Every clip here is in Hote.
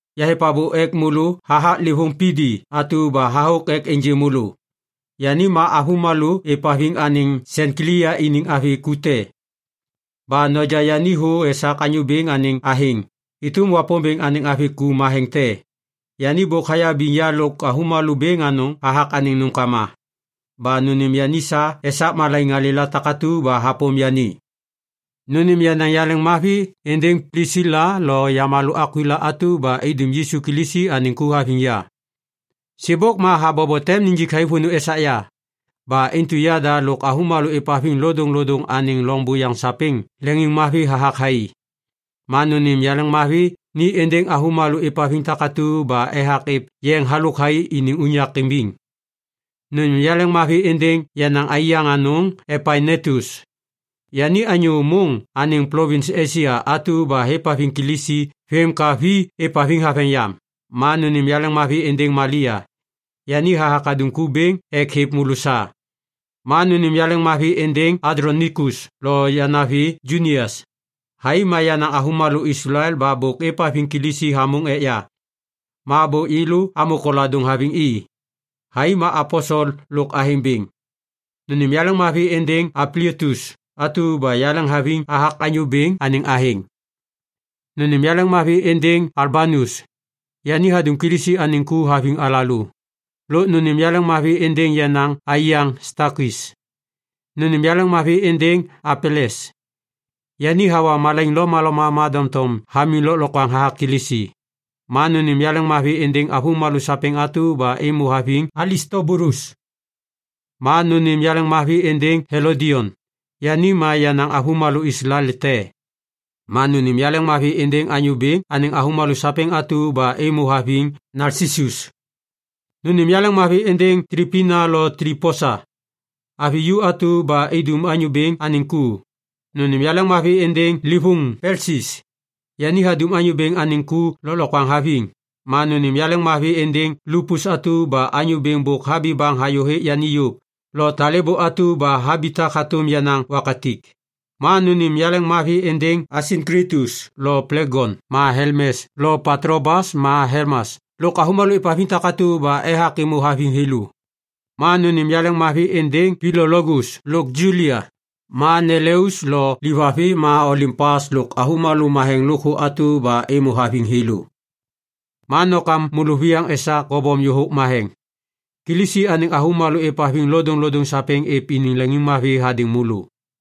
Yahêv abô ek môlô hathak livôŋ Pibi atu ba hathôk ek ênjê môlô. Yani ma avômalô êvhaviŋ anêŋ Senklia iniŋ avi ku te. Ba noja yani thô esak Anyô Bêŋ anêŋ athêŋ êtôm Wapômbêŋ anêŋ avi ku matheŋ te. Yani bôk hayabiŋ ya lôk avômalô bêŋ anôŋ hathak anêŋ nômkama. Ba nônêm yani sa esak malaiŋ malêla takatu ba hapôm yani. Nônêm yenaŋ yaleŋmavi êndêŋ Plisila lo yamalô Akwila atu ba idum Yisu Kilisi anêŋ ku haviŋ ya. Sêbôk ma habobo tem nijik thai vônô esak ya. Ba intu yada lôk avômalô êvhaviŋ lodôŋlodôŋ anêŋ loŋ buyaŋ sapêŋ leŋiŋmavi hathak thai. Ma nônêm yaleŋmavi ni êndêŋ avômalô êvhaviŋ takatu ba ethak êv yeŋ halôk thai iniŋ unyak imbiŋ. Nônêm yaleŋmavi êndêŋ yenaŋ aiyaŋ anôŋ Epainetus. Yani anyô môŋ anêŋ plovins Esia atu ba hêvhaviŋ Kilisi vêm ka vi êvhaviŋ haveŋ yam. Ma nônêm yaleŋmavi êndêŋ Malia. Yani hathak hadum ku bêŋ ek hêv môlô sa. Ma nônêm yaleŋmavi êndêŋ Andlonikus lo yanavi Junias. Thai ma yenaŋ avômalô Islael ba bôk êvhaviŋ Kilisi hamôŋ ek ya. Ma bôk yêlô amô koladôŋ haviŋ i. Thai ma aposel lôk athêŋ bêŋ. Nônêm yaleŋmavi êndêŋ Ampliatus atu ba yaleŋhaviŋ hathak Anyô Bêŋ anêŋ athêŋ. Nônêm yaleŋmavi êndêŋ Ulbanus, yani hadum Kilisi anêŋ ku haviŋ alalô. Lôk nônêm yaleŋmavi êndêŋ yenaŋ aiyaŋ Stakis. Nônêm yaleŋmavi êndêŋ Apeles, yani hawa malaiŋ lomaloma ma doŋtom hamiŋ lôklokwaŋ hathak Kilisi. Ma nônêm yaleŋmavi êndêŋ avômalô sapêŋ atu ba êmô haviŋ Alistobulus. Ma nônêm yaleŋmavi êndêŋ Helodion, yani ma yenaŋ avômalô Islael te. Ma nônêm yaleŋmavi êndêŋ Anyô Bêŋ anêŋ avômalô sapêŋ atu ba êmô haviŋ Nalsisus. Nônêm yaleŋmavi êndêŋ Tlipina lo Tliposa, avi ju atu ba idum Anyô Bêŋ anêŋ ku. Nônêm yaleŋmavi êndêŋ livôŋ Pelsis, yani hadum Anyô Bêŋ anêŋ ku lôklokwaŋ haviŋ. Ma nônêm yaleŋmavi êndêŋ Lupus atu ba Anyô Bêŋ bôk habi baŋ hayô hêk yôv lo talêbô atu ba habitak hatôm yenaŋ wakatik. Ma nônêm yaleŋmavi êndêŋ Asinklitus lo Plegon ma Helmes lo Patlobas ma Helmas lôk avômalô êvhaviŋ takatu ba ethak êmô haviŋ thêlô. Ma nônêm yaleŋmavi êndêŋ Pilologus lôk Julia, ma Neleus lo livavi ma Olimpas lôk avômalô matheŋ lôkthô atu ba êmô haviŋ thêlô. Ma nokam môlôviyaŋ esak kobom yôhôk matheŋ. Kilisi anêŋ avômalô êvhaviŋ lodôŋlodôŋ sapêŋ êv iniŋ leŋiŋmavi hadêŋ môlô.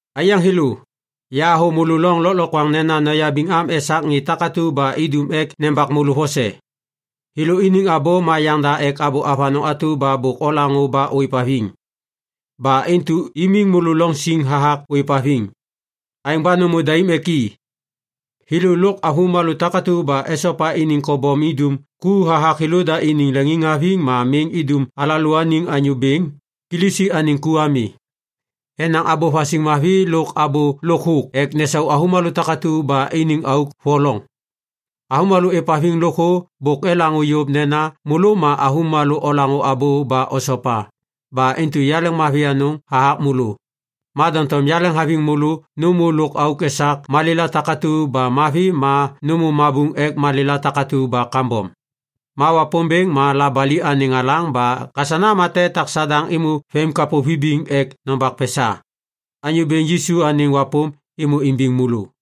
Aiyaŋ thêlô, yahathô môlô loŋ lôklokwaŋ nena noyabiŋ am esak ŋê takatu ba idum ek nembak môlô vose. Thêlô iniŋ abô ma yaŋda ek abô avanôŋ atu ba bôk olaŋô ba ôêvhaviŋ. Ba intu imiŋ môlô loŋ siŋ hathak ôêvhaviŋ. Aêŋ ba nômô daim ek i. Thêlô lôk avômalô takatu ba esopa iniŋ kobom idum ku hathak thêlôda iniŋ leŋiŋhaviŋ ma miŋ idum alalôaniŋ Anyô Bêŋ Kilisi anêŋ ku ami. Enaŋ abô vasiŋ mavi lôk abô lôk thôk ek nesau avômalô takatu ba iniŋ auk voloŋ. Avômalô êvhaviŋ lôkthô bôk elaŋô yôv nena môlô ma avômalô olaŋô abô ba osopa. Ba intu yaleŋmavi anôŋ hathak môlô. Ma doŋtom yaleŋhaviŋ môlô nômô lôk auk esak malêla takatu ba mavi ma nômô mabuŋ ek malêla takatu ba kambom. Ma Wapômbêŋ ma labali anêŋ alaŋ ba kasana ma tem etak Sadaŋ êmô vemimkapô vibiŋ ek nombak pesa. Anyô Bêŋ Yisu anêŋ wapôm êmô imbiŋ môlô.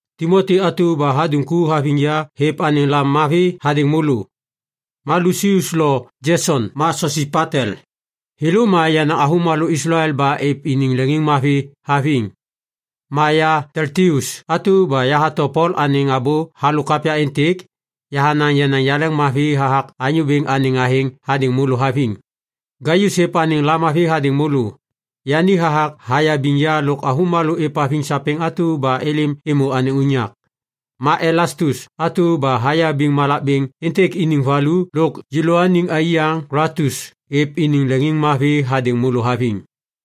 Timoti atu ba hadum ku haviŋ ya hêv anêŋ lamavi hadêŋ môlô. Ma Lusius lo Jeson ma Sosipatel, thêlô ma yenaŋ avômalô Islael ba êv iniŋ leŋiŋmavi haviŋ. Ma ya Teltius atu ba yahato Pol anêŋ abô halôk kapya êntêk, yahanaŋ yenaŋ yaleŋmavi hathak Anyô Bêŋ anêŋ athêŋ hadêŋ môlô haviŋ. Gaius hêv anêŋ lamavi hadêŋ môlô. Yani hathak hayabiŋ ya lôk avômalô êvhaviŋ sapêŋ atu ba êlêm êmô anêŋ unyak. Ma Elastus atu ba hayabiŋ malak bêŋ êntêk iniŋ valu lôk yêlôaniŋ aiyaŋ Kwaltus êv iniŋ leŋiŋmavi hadêŋ môlô haviŋ.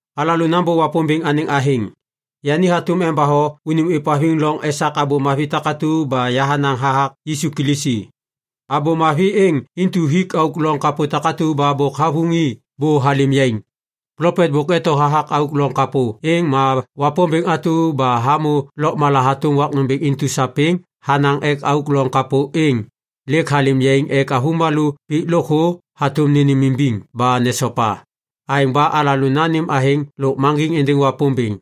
Alalô nambô Wapômbêŋ anêŋ athêŋ. Yani hatôm embatho unim ôêvhaviŋ loŋ esak Abô Mavi takatu ba yahanaŋ hathak Yisu Kilisi. Abô Mavi êŋ intu hik auk loŋ kapô takatu ba bôk havuŋ i bô halêm yaiŋ. Plopet bôk eto hathak auk loŋ kapô êŋ ma Wapômbêŋ atu ba hamô lôkmala hatôm wak nômbêŋ intu sapêŋ hanaŋ ek auk loŋ kapô êŋ lêk halêm yaiŋ ek avômalô pik lôkthô hatôm nênêmimbiŋ ba nesopa. Aêŋ ba alalô nanêm athêŋ lôkmaŋgiŋ êndêŋ Wapômbêŋ,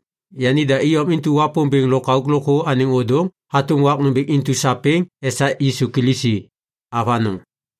yanida iyom intu Wapômbêŋ lôkauk lôkthô anêŋ ôdôŋ hatôm wak nômbêŋ intu sapêŋ esak Yisu Kilisi. Avanôŋ.